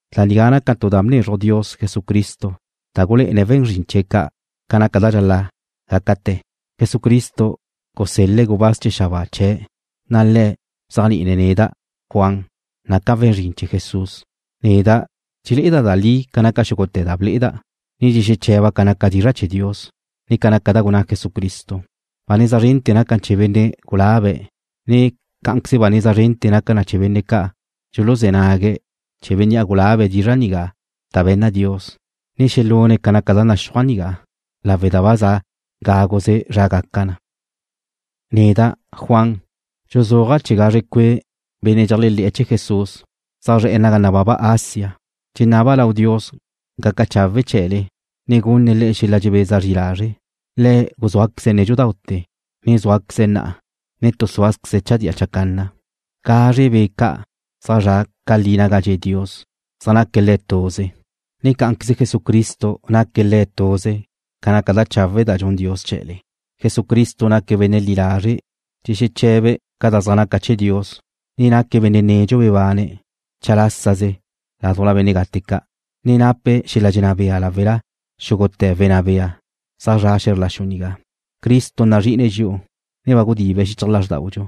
Da nigá naca tu da bnezruj Dios Jesucristo da gulé'ene̱' we̱n zrin chee̱' ca' ca naca da dxal-la' gácate̱. Jesucristo gusel-le̱' gubáz chee̱ xabáa chee̱', na' le̱' bzéajni'ine̱' neda', Juan, naca' we̱n zrin chee̱ Jesús. Neda' dxulé'eda' le'e da li ca naca xúgute̱ da ble'eda', ne dxexeche̱ba' ca naca dizra' chee̱ Dios, ne ca naca da gunná Jesucristo. Ba neza zrente̱ naca na chee̱ benne' gulabe̱', ne cá'anqueze ba neza zrente̱ naca na chee̱ benne' ca' dxuluzé̱ nague̱' chee̱ bénnea' gulabe̱' dizra' nigá da be̱nna Dios, ne xelune̱' ca naca da naxúaj nigá, lawe' da ba za gáguze zra gaca na. Neda', Juan, dxuzúaja' chee̱ gazre cue' benne' dxeléajle̱'e̱ chee̱ Jesús, zaj zre̱'e̱ naga nababa Asia. Dxenaba' lau Dios gaca chawe' chee̱le, ne gunne̱' le'e xel-la' dxebeza zri lazre'. Le̱' guzúaqueze̱' nédxudaute̱, ne zúaqueze̱' na'a, ne tu súazqueze̱' chadía chacanna. Gazre Be' ca' zaj zra' ca li naga dxe' Dios zaj naca Le̱' tuze, ne cá'anqueze Jesucristo naque̱' Le̱' tuze ca naca da chawe' da dxun Dios chee̱le. Jesucristo naque̱' benne' li lazre' dxexeche̱be̱' ca da zaj naca chee̱ Dios, ne naque̱' benne' nedxu bebane̱' chalásaze ládujla benne' gate ca', ne nape̱' xel-la' dxenná bea láwela xúgute̱ wenná bea zaj zre̱'e̱ xe̱zr la xu nigá. Cristo nazri'ine̱' dxi'u, ne ba gudibe̱' xichaj lázrdaudxu.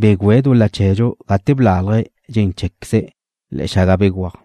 Begüe̱' dul-la chee̱dxu gate blálaje̱' dxen cheé̱queze̱' le̱'e̱ xaga begúaj.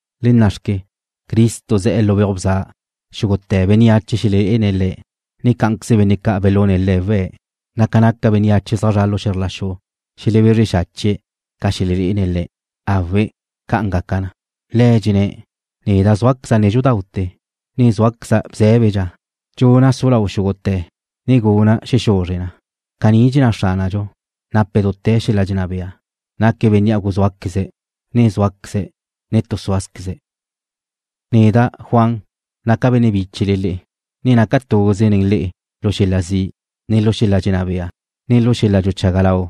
Le na' xque. Cristo ze̱'e̱ lu beuj bza. Xúgute̱ bénneache xelelé'ene̱' Le̱', ne cá'anqueze benne' ca' belune̱' Le̱' we̱', na' ca naca bénneache zaj zra' lu xe̱zr la xu xelebezre xache̱'e̱ ca xelelé'ene̱' Le̱'. ¡Awe', ca'an gaca na! Le̱' dxenné̱': “Neda' zúaqueza' nédxudaute̱, ne zúaqueza' bzé̱bedxa. Dxuna' su lau sua xúgute̱ ne guna' xexuzre na.” Caní dxenná Xránadxu, nape̱' dute̱ xel-la' dxenná bea, naque̱' Bénnea' guzúaqueze̱', ne zúaqueze̱', ne tu súazqueze̱'. Neda', Juan, naca' benne' bíchele le'e, ne naca' tuze nen le'e lu xel-la' zi', ne lu xel-la' dxenná bea, ne lu xel-la' dxuchaga lau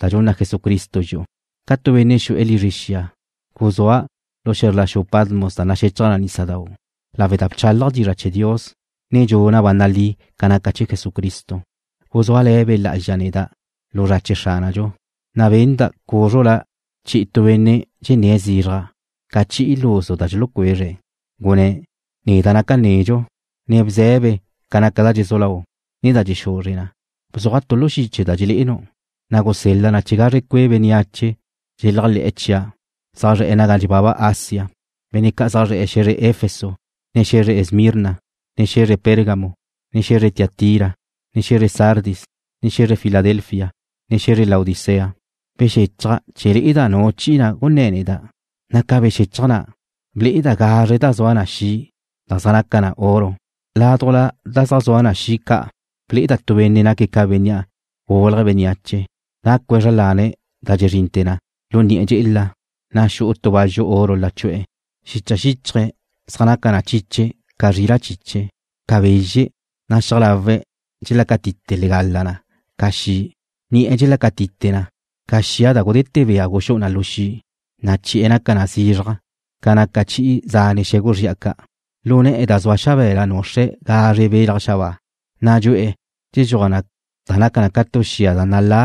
da dxunna Jesucristo dxi'u. Ca tu benne' xu'e̱ lizre xia guzúa' lu xe̱zr la xu Patmos da naxechaj nísadau', lawe' da bchálaja' dizra' chee̱ Dios ne dxuna' ba nalí ca naca chee̱ Jesucristo. Guzúale̱ Be' Lá'azxa neda' lu zra chee̱ Xránadxu, na' benda' cúzrula' chi'i tu benne' dxenné̱' zizraj ca chi'i luzu da dxulucuezre̱'. Gunné̱': ―Neda' naca' nedxu, ne bze̱be ca naca da dxezú lau, ne da dxexuzre na. Bzuaj tu lu xiche da dxelé'enu', na' gusel-la na chee̱ gazre cue' bénneache dxeléajle̱'e̱ chia', zaj zre̱'e̱ naga nababa Asia, benne' ca' zaj zre̱'e̱ xe̱zre Efeso, ne xe̱zre Esmirna, ne xe̱zre Pérgamo, ne xe̱zre Tiatira, ne xe̱zre Sardis, ne xe̱zre Filadelfia, ne xe̱zre Laodicea. Bexéchaja' chee̱ le'eda' nu chi'i na' gunné̱ neda', na' ca bexéchaja' na', ble'eda' gazre da zua na xi' da' zaj naca na oro. Laduj da zaj zua na xi' ca' ble'eda' tu benne' naque̱' ca Bénnea' gulje̱' bénneache, nácue̱' zra lane̱' da dxezrinte̱ lu ni'e̱ dxe'ela, na' xu'u tu bazxu oro lachu'e̱. Xicha xíchaje̱' zaj naca na chiche ca zrila' chiche, u ca bezxe', na' xiaj lawe̱' dxelácatite legala na ca xi'. Ni'e̱ dxelácatite na ca xia da gudete̱ bea guxú'u na lu xi', na' chi'e̱ naca na zizraj ca naca chi'i zane' xe̱gu zri'a ca'. Lu ne̱'e̱ da zua xabe̱la nuxre̱' da ca' zaj naca ca gazre belaj xabáa, na' dxu'e̱ dxedxuaj da naca na ca tu xia da nalá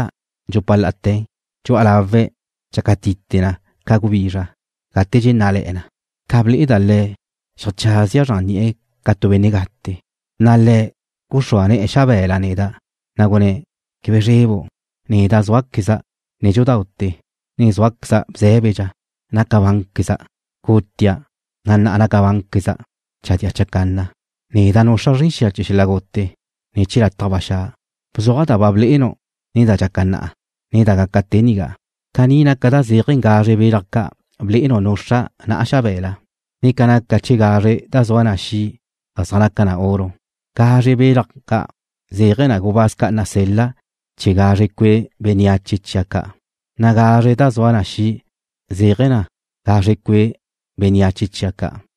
dxupa la'ate̱. Dxu'a lawe̱' dxácatite na ca gubizra gate dxennále̱'e̱ na. Ca ble'eda' Le̱', xeajchazia' zran ni'e̱ ca tu benne' gate. Na' Le̱' guxrúa ne̱'e̱ xabe̱la neda', na' gunné̱': ―Quebe zrebu'. Neda' zúaqueza' nédxudaute̱, ne zúaqueza' bzé̱bedxa. Naca bánqueza'. Gutia', na' na'a nabánqueza' chadía chacanna. Neda' nuxra' zren xia chee̱ xel-la' gute, ne chee̱ lataj ba xa'. Bzuaj da ba blé'enu' ne da dxaca na'a, ne da gaca te nigá. Caní naca da zéaje̱ ca gazre belaj ca' blé'enu' nuxra' na'a xabe̱la, ne ca naca chee̱ gazre da zua na xi' da' zaj naca na oro. Gazre da zaj naca ca belaj ca' zéaje̱ na gubáz ca' nasel-la' chee̱ gazre cue' bénneache chia' ca', na' gazre da zua na xi' zéaje̱ na gazre cue' bénneache chia' ca'.